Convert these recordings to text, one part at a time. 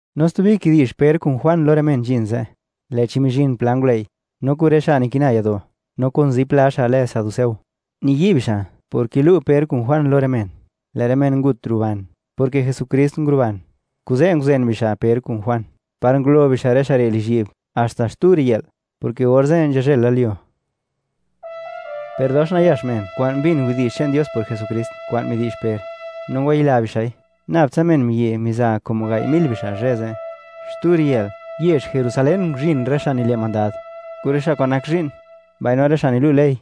No stubi kidi'zh Per kun Juan lo rë men nzhin ze', lë'chi mizhin pla ngulëi', no kun rë xa' nikina yado', no kun zipla xa' lë saduceo. Niyi' bixa' por kilu' Per kun Juan lo rë men, lë' rë men ngut ruban, porke Jesukrist nguruban. Kuze' nguzen bixa' Per kun Juan, par ngulo bixa' rë xa' re' lizhyi'b haxta xtu riyë'l, porke orze' nzhazhëlalyuo. Per dox nayax men kwa'n mbin widi'zh che'n Dios por Jesukrist kwa'n midi'zh Per, no ngwayila bixa'i. Nabtsa men miyi' miza como gai' mil bixa' zhë ze'. Xtu riyë'l, yezh Jerusalén nguzhin rë xa' nile' mandad, kun rë xa' kwa'n nak zhi'n, mbaino rë xa' nilu' ley;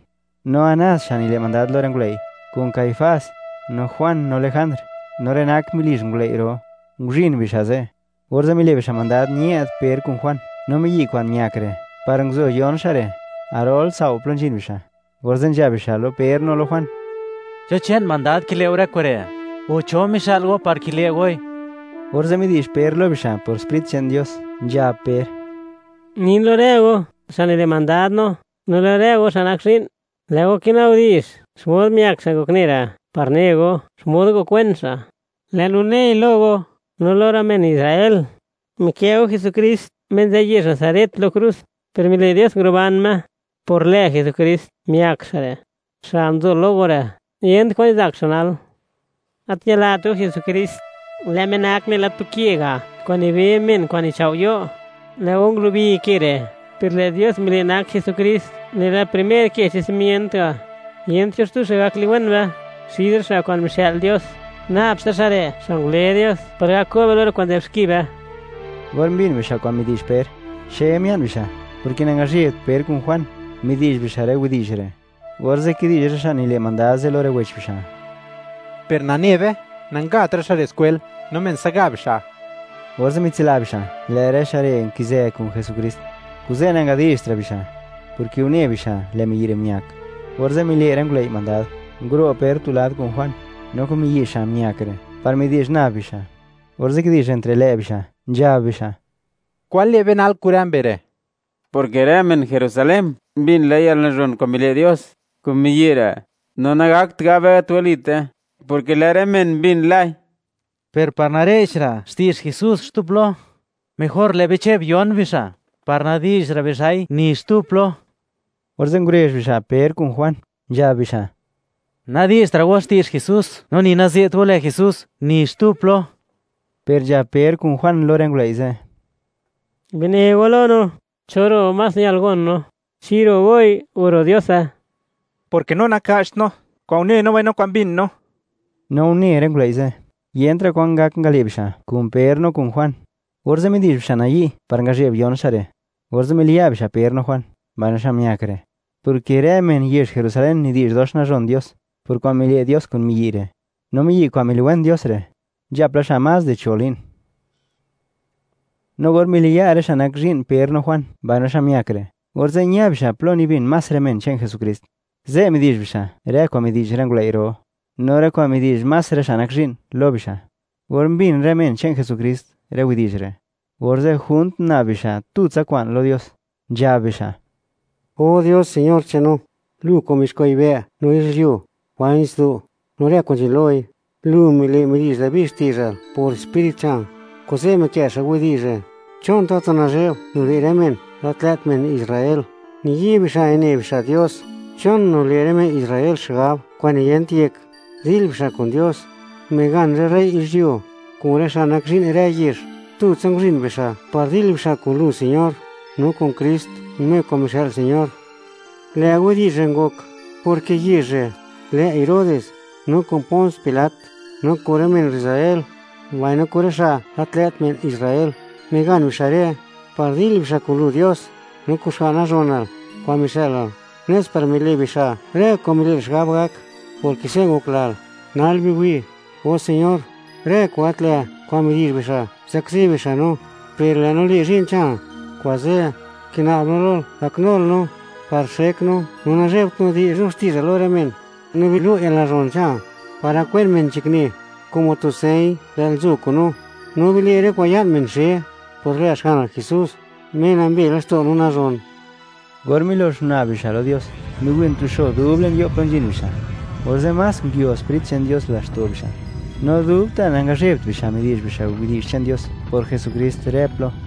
no Anás xa' nile' mandad lo rë ngulëi', kun Caifás, no Juan, no Jand, no rë nak melizh ngulëi' ro'; nguzhin bixa' ze'. Orze' mile' bixa' mandad ñë'd Per kun Juan, no miyi' kwa'n miak re', par nguzo yon xa' re', garol tsao' plo nzhin bixa'. Orze' nzhab bixa' lo Per no lo Juan: ―¿Cho che'n mandad kile' go rë kure'?, o, ¿cho mixë'l go par kile' goi? Orze' midi'zh Per lo bixa' por Sprit che'n Dios, nzhab Per: ―Nin lo rë go, xa' nile' mandad no, no lo rë go xa' nak zhi'n: Lë' go kinabdi'zh xmod uniwen xa' ngokne re' par ne go, xmod ngokwen xa'. Lë' no nei lo go, no lo rë men Israel. Mikë' go Jesukrist Me nzë yezh Nazaret lo krus, per mile' Dios nguruban Me. Por lë Jesukrist, miak xa' re', xa' nzo lo go re', yent kwa'n nizak xa' nal. Gat ñilat go Jesukrist. Lë' Me nak nela tu ke ga', kwa'n nibe men kwa'n nichao' yo'. Lë' go ngulubi ke re', per lë' Dios mile' nak Jesukrist nela primer ke che'n simient ga'. Yent cho xtu xa' gak liwen be; xid rë xa' kwa'n mixë'l Dios, nab tsa xa' re', xa' ngule Dios par gak ko' be lo rë kwa'n nzë'b xki be. Or mbin bixa' kwan midi'zh Per, xe mia'n bixa', porke nangazhebt Per kun Juan, midi'zh bixa' rë widi'zh re'. Orze' kidi'zh rë xa' nile' mandad ze' lo rë wech bixa': “Per nane be, nangat rë xa' re' skwel, no men se'ga bixa'.” Orze' mitsila bixa' lë' rë xa' re' nki'zë kun Jesukrist, kuze' nangadi'zhtra' bixa', porke une bixa', lë' miyi' re' miak. Orze' mile' rë ngulëi' mandad, nguro' Per tu lad kun Juan, no kun miyi' xa' miak re', par midi'zh nab bixa'. Orze' kidi'zh entre lë' bixa', nzhab bixa': ―¿Kwan le' be nal kun rë mbe re'?, porke rë men Jerusalén mbin la yalnazhon kwa'n mile' Dios kun miyi' re'. No nagakt gab be: “Gat walite”, porke lë' rë men mbin lai. Per par nare'chra' xti'zh Jesús xtu plo, mejor lë' be che'b yon bixa', par nadi'zhra' bixa'i ni xtu plo. Orze' ngurezh bixa' Per kun Juan, nzhab bixa': ―Nadi'zhtra' go xti'zh Jesús, no ni naze't go lë Jesús ni xtu plo. Per nzhab Per kun Juan lo rë ngulëi' ze': ―Bine go lo no, ¿cho ro' más ñal gon no? ¿Chi ro' goi, o ro' Diose?, porke no naka'cht no kwa'n une no, mbaino kwa'n mbin no. No une rë ngulëi' ze', yentra' kwan ngak ngale' bixa' kun Per no kun Juan. Orze' midi'zh bixa' nayi' par ngazheb yon xa' re'. Orze' miliya' bixa' Per no Juan, mbaino xa' miak re', porke rë men yezh Jerusalén nidi'zh dox nazhon Dios, por kwa'n mile' Dios kun miyi' re'. No miyi' kwa'n miliwen Dios re', nzhap la xa' más di cho' li'n. No or miliya' rë xa' nak zhi'n Per no Juan, mbaino xa' miak re', orze' ña bixa' plo nibin más rë men che'n Jesukrist. Ze' midi'zh bixa' rë kwa'n midi'zh rë ngulëi' ro, no rë kwa'n midi'zh más rë xa' nak zhi'n, lo bixa'. Or mbin rë men che'n Jesukrist rë widi'zh re', orze' junt guna'b bixa' tutsa kwa'n lo Dios, nzhab bixa': ―O Dios Señor che'n no, Lu kwa'n mizuxkwa' yibë', no yizhyuo, mbaino nitsdo', no rë kwa'n nzhin loi. Lu mile' midi'zh Dabi xti'zhal por Sprit che'nal, kuze' mikë' xa' widi'zh re': ¿Chon tatu nazhe'b nile' rë men gat lë't men Israel, niyi' bixa' nine bixa' Dios? ¿Chon nile' rë men Israel xigab kwa'n niyent yek, dil bixa' kun Dios? Migan rë rey yizhyuo, kun rë xa' nak zhi'n rë yezh, tutsa nguzhin bixa' par dil bixa' kun Lu Señor, no kun Krist, Me kwa'n mixë'l Señor. ’Lë' widi'zh re' ngok, porke yezh re', lë' Herodes no kun Pons Pilat, no kun rë men Israel, mbaino kun rë xa' gat lë't men Israel, migan bixa' re' par dil bixa' kun Lu Dios, no kun Xga'n nazhonal kwa'n mixë'lal, nes par mile' bixa' rë kwa'n mile'lal xigab gak, porke se' ngoklal. Nal biwi', O Señor, rë kwa'n gat lë' kwa'n midi'zh bixa', zakzi bixa' no. Per lë' no le' zhi'n che'nal. Kuze', kina'b no lol, gaknul no, par xek no, no nazhebt no di'zh no xti'zhal lo rë men. No bilu' yalnazhon che'nal, par gak wen men nzhakne, como tu señ lë'l nzo kun no; no bile' rë kwa'n ña'n men xe, por lë Xga'nal Jesús, Me nambe laxto' no nazhon. Or milox mina'b bixa' lo Dios, miwin tu xo dub le'n yo' plo nzhin bixa'. Orze' más nguio Sprit che'n Dios laxto' bixa', no dubta' nangazhebt bixa' midi'zh bixa' widi'zh che'n Dios por Jesukrist rë plo.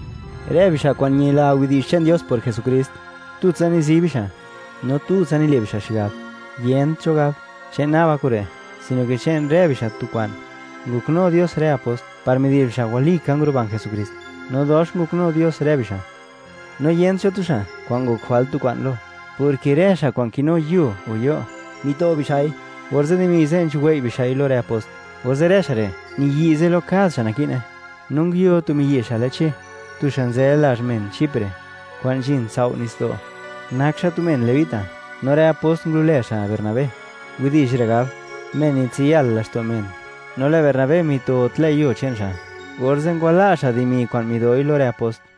Rë bixa' kwa'n ñila widi'zh che'n Dios por Jesukrist, tutsa nizi bixa', no tutsa nile' bixa' xigab. Yent cho gab: “Che'n naba kure'”, sino ke che'n rë bixa' tu kwa'n. Ngoknu Dios rë apost par midi'zh bixa' walika nguruban Jesukrist, no dox ngoknu Dios rë bixa'. No yent cho tu xa' kwa'n ngok jwalt tu kwa'n lo, porke rë xa' kwa'n kinu yuo o yo', mito bixa'i, orze' dimi ze' nzhuwei' bixa'i lo rë apost, orze' rë xa' re' niyi'ze lo kad xa' naki'ne. No nguio tu miyi' xa' lë Che, tu xa' nzë lazh men Chipre, kwa'n nzhin tsao' nitsdo'. Nak xa' tu men Levita, no rë apost ngulo'lë xa' Bernabé; widi'zh re' gab: Men nitsiyal laxto' men. No lë' Bernabé mito tlë' yuo che'n xa', orze' ngwala' xa' dimi kwa'n midoi lo rë apost.